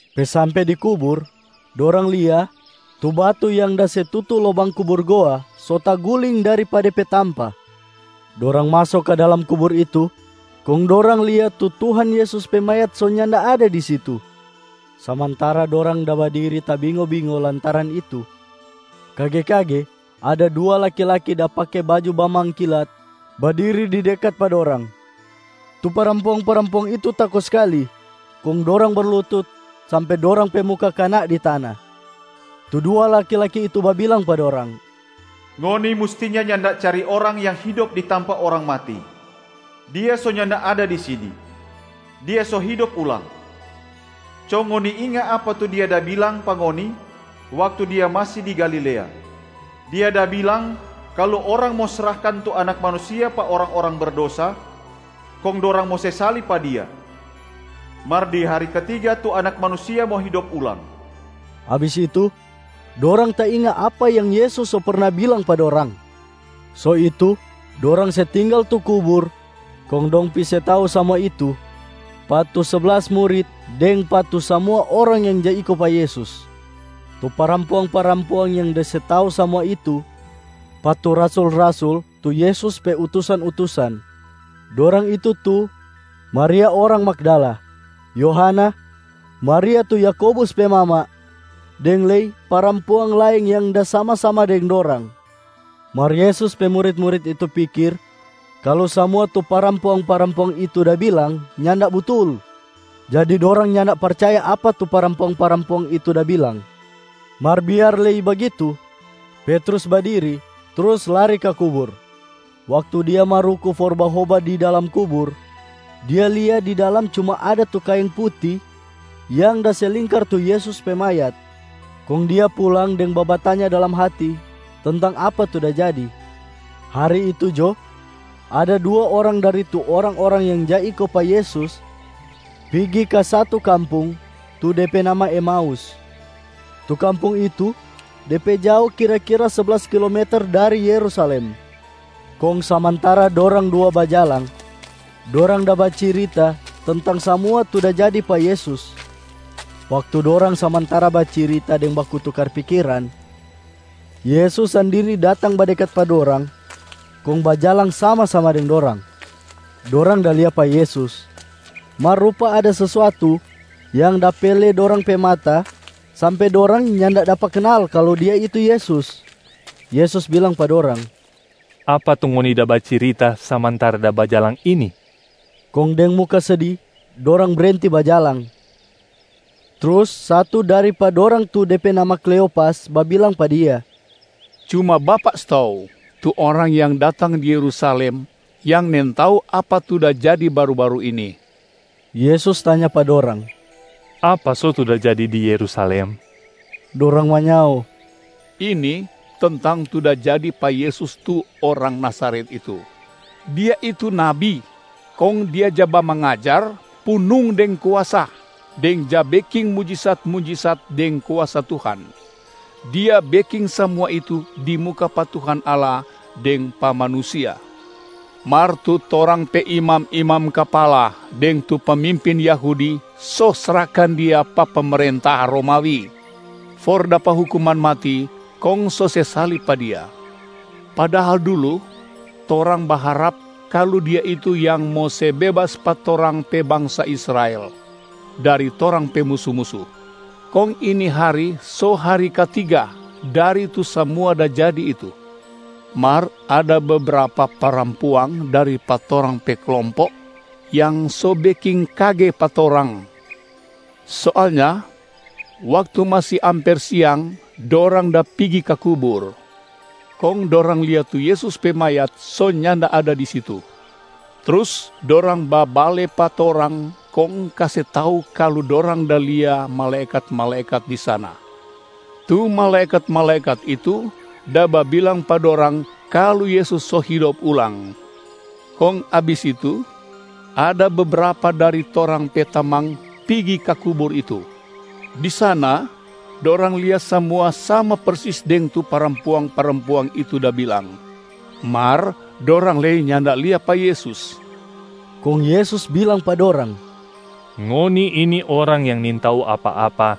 Pe sampe di kubur, dorang lia tu batu yang da se tutu lobang kubur goa so taguling dari pa de pe tampa. Dorang maso ka dalam kubur itu, kong dorang lia tu Tuhan Yesus pe mayat so nyanda ada di situ. Samantara dorang da badiri tabingo-bingo lantaran itu, kage-kage ada dua laki-laki da pake baju bamangkilat badiri di dekat pa dorang. Tu parampuang-parampuang itu tako skali kong dorang berlutut sampe dorang pe muka kana di tana. Tu dua laki-laki itu babilang pa dorang, “Ngoni mustinya nyanda cari orang yang hidop di tampa orang mati. Dia so nyanda ada di sini, Dia so hidop ulang. Co ngoni inga apa tu Dia da bilang pa ngoni waktu Dia masi di Galilea. Dia da bilang kalu orang mo srahkan tu Anak Manusia pa orang-orang berdosa, kong dorang mo se salib pa Dia. Mar di hari katiga tu Anak Manusia mo hidop ulang.” Abis itu, dorang tainga apa yang Yesus so perna bilang pa dorang. So itu, dorang se tinggal tu kubur kong dong pi se tau samua itu pa tu seblas murit deng pa tu samua orang yang ja iko pa Yesus. Tu parampuang-parampuang yang da se tau samua itu pa tu rasul-rasul tu Yesus pe utusan-utusan, dorang itu tu: Maria orang Magdala, Yohana, Maria tu Yakobus pe mama deng lei parampuang laeng yang da sama-sama deng dorang. Mar Yesus pe murit-murit itu pikir kalu samua tu parampuang-parampuang itu da bilang nyanda butul, jadi dorang nyanda percaya apa tu parampuang-parampuang itu da bilang. Mar biar lei bagitu, Petrus badiri trus lari ka kubur. Waktu dia maruku for bahoba di dalam kubur, dia lia di dalam cuma ada tu kaeng puti yang da se lingkar tu Yesus pe mayat. Kong dia pulang deng babatanya dalam hati tentang apa tu da jadi. Hari itu jo, ada dua orang dari tu orang-orang yang ja iko pa Yesus pigi ka satu kampung tu de pe nama Emaus. Tu kampung itu de pe jao kira-kira seblas kilometer dari Yerusalem. Kong samantara dorang dua bajalang, dorang da bacirita tentang samua tu da jadi pa Yesus. Waktu dorang samantara bacirita deng baku tukar pikiran, Yesus sandiri datang badekat pa dorang kong bajalang sama-sama deng dorang. Dorang da lia pa Yesus mar rupa ada sesuatu yang da pele dorang pe mata sampe dorang nyanda dapa kanal kalu Dia itu Yesus. Yesus bilang pa dorang, “Apa tu ngoni da bacirita samantara da bajalang ini?” Kong deng muka sedi dorang brenti bajalang. Trus satu dari pa dorang tu de pe nama Kleopas babilang pa Dia, “Cuma Bapak stou tu orang yang datang di Yerusalem yang nintau apa tu da jadi baru-baru ini.” Yesus tanya pa dorang, “Apa so tu da jadi di Yerusalem?” Dorang manyao, “Ini tentang tu da jadi pa Yesus tu Orang Nazaret itu. Dia itu Nabi kong Dia ja bamangajar punung deng kuasa deng ja beking mujisat-mujisat deng kuasa Tuhan, Dia beking samua itu di muka pa Tuhan Allah deng pa manusia. Mar tu torang pe imam-imam kapala deng tu pemimpin Yahudi so srahkan Dia pa pemerenta Romawi for dapa hukuman mati kong so se salib pa Dia. Padahal dulu torang baharap kalu Dia itu yang mo se bebas pa torang pe bangsa Israel dari torang pe musu-musu. Kong ini hari so hari katiga dari tu samua da jadi itu. Mar ada bebrapa parampuang dari pa torang pe klompo yang so beking kage pa torang. Soalnya waktu masi amper siang dorang da pigi ka kubur, kong dorang lia tu Yesus pe mayat so nyanda ada di situ. Trus dorang babale pa torang kong kase tau kalu dorang da lia malaekat-malaekat di sana. Tu malaekat-malaekat itu da babilang pa dorang kalu Yesus so hidop ulang. Kong abis itu, ada bebrapa dari torang pe tamang pigi ka kubur itu. Di sana dorang lia samua sama persis deng tu parampuang-parampuang itu da bilang, mar dorang lei nyanda lia pa Yesus.” Kong Yesus bilang pa dorang, “Ngoni ini orang yang nintau apa-apa.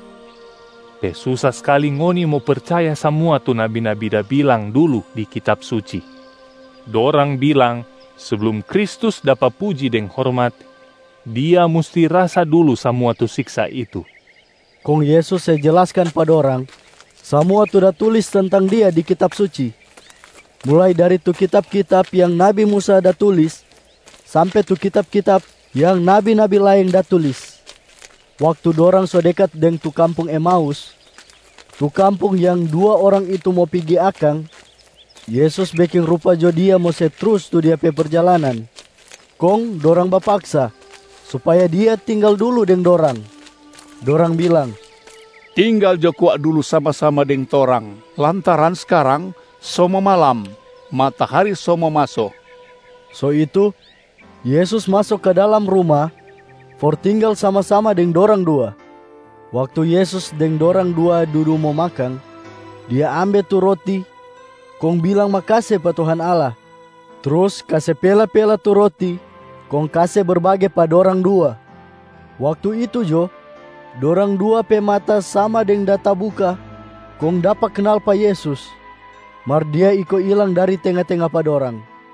Pe susa skali ngoni mo percaya samua tu nabi-nabi da bilang dulu di Kitab Suci. Dorang bilang seblum Kristus dapa puji deng hormat, Dia musti rasa dulu samua tu siksa itu.” Kong Yesus se jelaskan pa dorang samua tu da tulis tentang Dia di Kitab Suci, mulai dari tu kitab-kitab yang nabi Musa da tulis sampe tu kitab-kitab yang nabi-nabi laeng da tulis. Waktu dorang so dekat deng tu kampung Emaus, tu kampung yang dua orang itu mo pigi akang, Yesus beking rupa jo Dia mo se trus tu Dia pe perjalanan. Kong dorang bapaksa supaya Dia tinggal dulu deng dorang. Dorang bilang, “Tinggal jo kwa dulu sama-sama deng torang lantaran skarang so mo malam, matahari so mo maso.” So itu Yesus maso ka dalam ruma for tinggal sama-sama deng dorang dua. Waktu Yesus deng dorang dua dudu mo makang, Dia ambe tu roti kong bilang makase pa Tuhan Allah, trus kase pela-pela tu roti kong kase berbage pa dorang dua. Waktu itu jo dorang dua pe mata sama deng da tabuka kong dapa kanal pa Yesus, mar Dia iko ilang dari tenga-tenga pa dorang.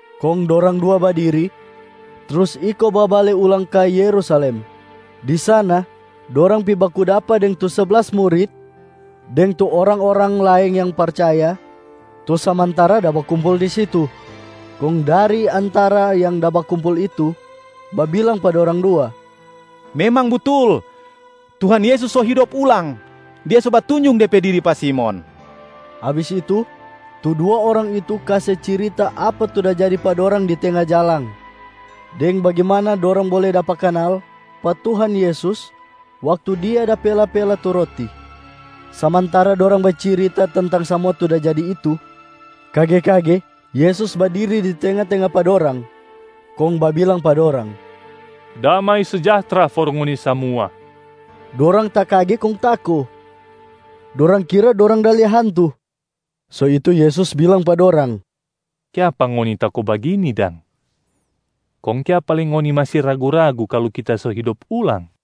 Kong dorang dua badiri trus iko babale ulang ka Yerusalem. Di sana dorang pi baku dapa deng tu seblas murit deng tu orang-orang laeng yang percaya tu samantara da bakumpul di situ. Kong dari antara yang da bakumpul itu babilang pa dorang dua, “Memang butul, Tuhan Yesus so hidop ulang, Dia so batunjung De pe diri pa Simon.” Abis itu, tu dua orang itu kase cirita apa tu da jadi pa dorang di tenga jalang, deng bagimana dorang bole dapa kanal pa Tuhan Yesus waktu Dia da pela-pela tu roti. Samantara dorang bacirita tentang samua tu da jadi itu, kage-kage Yesus badiri di tenga-tenga pa dorang kong babilang pa dorang, “Damai sejahtra for ngoni samua!” Dorang takage kong tako, dorang kira dorang da lia hantu. So itu, Yesus bilang pa dorang, “Kiapa ngoni tako bagini dang? Kong kiapa lei ngoni masi ragu-ragu kalu Kita so hidop ulang?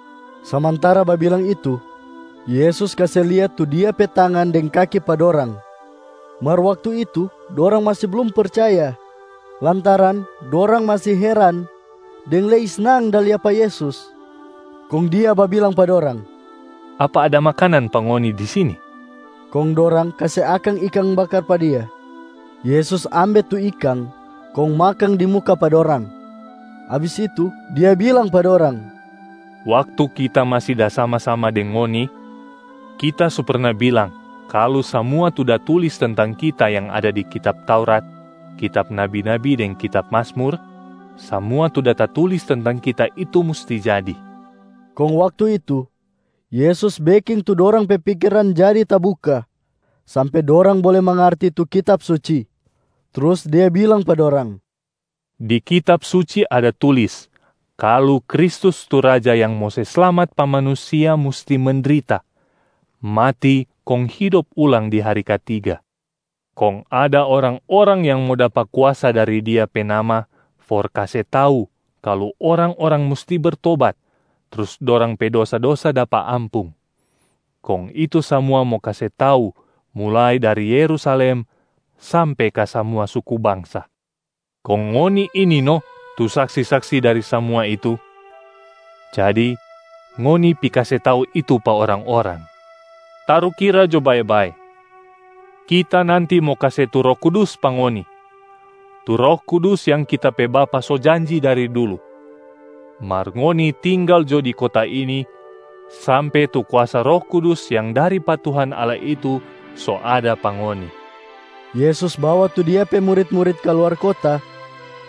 Samantara babilang itu, Yesus kase lia tu Dia pe tangan deng kaki pa dorang. Mar waktu itu dorang masi blum percaya lantaran dorang masi heran deng lei snang da lia pa Yesus, kong Dia babilang pa dorang, “Apa ada makanan pa ngoni di sini?” Kong dorang kase akang ikang bakar pa Dia. Yesus ambe tu ikang kong makang di muka pa dorang. Abis itu Dia bilang pa dorang, “Waktu Kita masi da sama-sama deng ngoni, Kita so perna bilang kalu samua tu da tulis tentang Kita yang ada di kitab Taurat, kitab nabi-nabi deng di kitab Mazmur, samua tu da tatulis tentang Kita itu musti jadi.” Kong waktu itu Yesus beking tu dorang pe pikiran jadi tabuka sampe dorang bole mangarti tu Kitab Suci. Trus Dia bilang pa dorang, “Di Kitab Suci ada tulis kalu Kristus tu Raja yang mo se slamat pa manusia musti mendrita, mati kong hidop ulang di hari katiga. Kong ada orang-orang yang mo dapa kuasa dari Dia pe nama for kase tau kalu orang-orang musti bertobat trus dorang pe dosa-dosa dapa ampung, kong itu samua mo kase tau mulai dari Yerusalem sampe ka samua suku bangsa. Kong ngoni ini no tu saksi-saksi dari samua itu, jadi ngoni pi kase tau itu pa orang-orang. Tarukira jo bae-bae, Kita nanti mo kase tu Roh Kudus pa ngoni, tu Roh Kudus yang Kita pe Bapa so janji dari dulu. Mar ngoni tinggal jo di kota ini sampe tu kuasa Roh Kudus yang dari pa Tuhan Allah itu so ada pa ngoni.” Yesus bawa tu Dia pe murit-murit kaluar kota,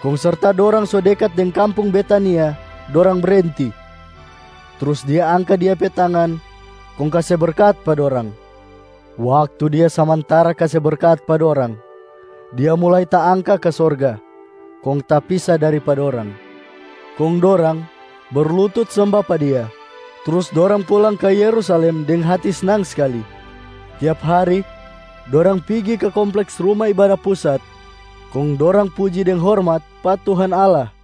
kong serta dorang so dekat deng kampung Betania dorang brenti, trus Dia angka Dia pe tangan kong kase berkat pa dorang. Waktu Dia samantara kase berkat pa dorang, Dia mulai taangka ka sorga kong tapisa dari pa dorang. Kong dorang berlutut semba pa Dia. Trus dorang pulang ka Yerusalem deng hati snang skali. Tiap hari dorang pigi ka kompleks Ruma Ibada Pusat kong dorang puji deng hormat pa Tuhan Allah.